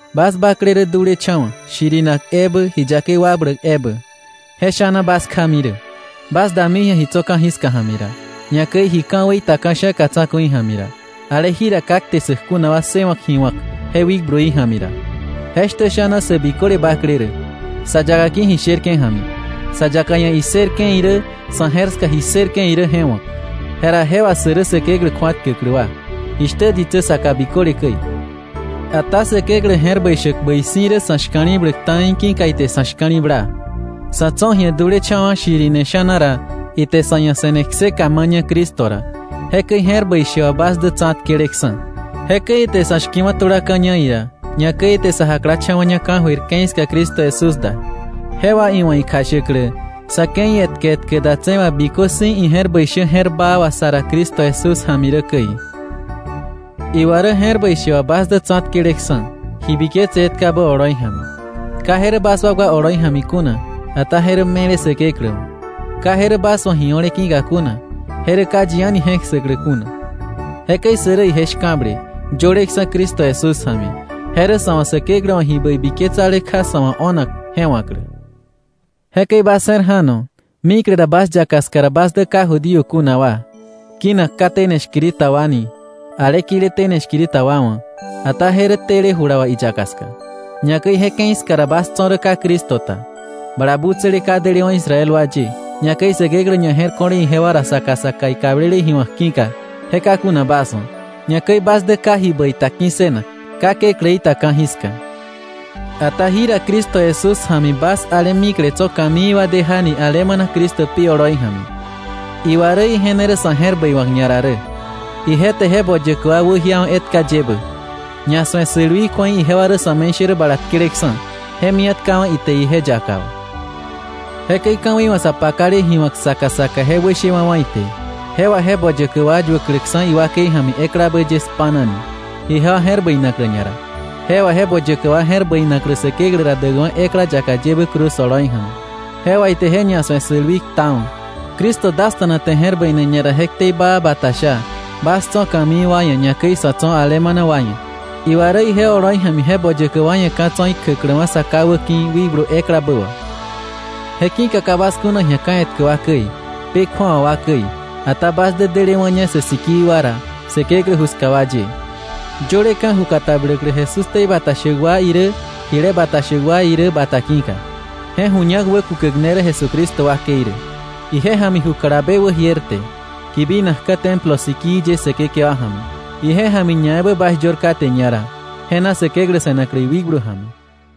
Bas bakle rä dulecha̱wa̱ shirinak ebä, ji yakei wakbläk ebä. Je sha̱na bas kjami rä, bas dami ji̱a ji tso̱ ka̱jiska ja̱mi ra, ñakäi ji ka̱wei ta ka̱sha̱ka tsa̱ku̱i ja̱mi ra, ale jira ka kte ssäk kuna wa ssëwa̱k ji wa̱k je wikbluí ja̱mi ra. Jeshtä sha̱na sä biköle bakle rä, sa yaka ki̱ ji sherke̱ ja̱mi, sa yaka ia̱ issërke̱ irä, sa̱ je̱r ska ji ssërke̱ irä je wa̱k, jera je wà sä rä Säkeklä kju̱atkäklä wa, jishtä ditsä saka biköle käi. Ata Säkeklä je̱r bäi shäk bäi si̱ rä sa̱ shka̱li̱bläk ta̱i ki̱ka ite sa̱ shka̱li̱bla. Sa̱ tso̱ ji̱a dulecha̱wa̱ shirine sha̱na ra, ite sa̱ ia̱ se̱ne kseka ma̱ña Cristo ra. Jekäi je̱r bäi she wà bas dä tsa̱tkeleksa̱. Jekäi ite sa̱ shki̱wa̱ tulaka̱ña ira, ñakäi ite sa jaklacha̱wa̱ña ka̱jöir ke̱i ska Cristo Jesús da, je wà iwa̱ ikjashäklä sa̱ ke̱i etkä etkä datse̱ wà bikö si̱ ije̱r bäi shä je̱r baa wà sa ra Cristo Jesús ja̱mi rä käi. Iwa rä je̱r bäi she wà bas dä tsa̱tkeleksa̱, ji biketse etkabä oloi ja̱mi. Ka je rä bas wakwa oloi ja̱mi kuna, ata je rä me̱le Säkeklä wa̱. Ka je rä bas wa̱ ji o̱le ki̱ka kuna, je rä ka yi a̱ni je̱k ssäklä kuna. Jekäi sä rä ije shka̱ble, yöleksa̱ Cristo Jesús ja̱mi. Je rä sa̱ wa̱ Säkeklä wa̱ ji bäi biketsale kja sa̱ wa̱ o̱nak je wa̱klä. Jekäi bas je̱r ja̱no, mikle ra bas yaka ska ra bas dä ka Judío kuna wa, kinak “ka tene shkiri ta wa” ni ale kile “tene shkiri ta wa” wa̱, ata je rä tele jula wà iyaka ska. Ñakäi je ke̱i ska ra bas tso̱ rä ka Cristo ta, bala butsäle ka delewa̱ Israel wa ye, ñakäi Säkeklä ñaje̱rko̱le ijewa ra saka saka ikablele ji wa̱k ki̱ka, je ka kuna bas wa̱, ñakäi bas dä ka ji bäi ta ki̱ssënak, ka Kekläí ta ka̱jiska. Ata jira Cristo Jesús ja̱mi bas ale mikle tso̱ ka̱mii wa dejani alemana Cristo pi oloi ja̱mi. Iwa rä ije ne rä sa̱ je̱r bäi wa̱k ñara rä. Ije te je boyäkä wa wäjiawa̱ etka yebä. Ñasu̱e sälwii kju̱ei ijewa rä sa̱me̱ishärä bala tkeleksa̱, je mia̱tkawa̱ ite ije yaka wà. Jekäi ka̱wei wa̱ sa pakale ji wa̱k saka saka je wäshewa̱wa̱ ite, je wà je boyäkä wa yuäkläksa̱ iwakei ja̱mi eklabä ye spa̱nani, ijewa je̱r bäinaklä ñara, je wà je boyäkä wa je̱r bäinaklä Säkeklä ra däkwa̱ ekla yaka yebä cruz oloi ja̱mi. Je wà ite je ñasu̱e sälwii ktawa̱. Cristo dasta̱na te je̱r bäine ñara je ktei baa bata sha, bas tso̱ ka̱mii wa ia̱, ñakäi sä tso̱ alemana wa ia̱. Iwa rä ije oloi ja̱mi je boyäkä wa ia̱ ka̱ tso̱ ikjäkläwa̱ Sa Ká wäki̱ Wikblu eklabä wà. Je ki̱ka ka bas kuna ji̱a ka̱ etkä wa käi, pë kju̱awa wa käi, ata bas dä delewa̱ña sä sikii wa ra, Säkeklä ju ska wa ye, yöleka̱ ju katabläklä Jesús ktei bata shäk wa irä jile bata shäk wa irä bata ki̱ka. Je ju ñak wäkukäk ne rä Jesucristo wakei rä. Ije ja̱mi ju kalabe wäjierte, kibinakka̱ templo sikii ye Säkekewa ja̱mi. Ije ja̱mi ñaebä bas yör kate ñara je na Säkeklä se̱naklä iwikblu ja̱mi.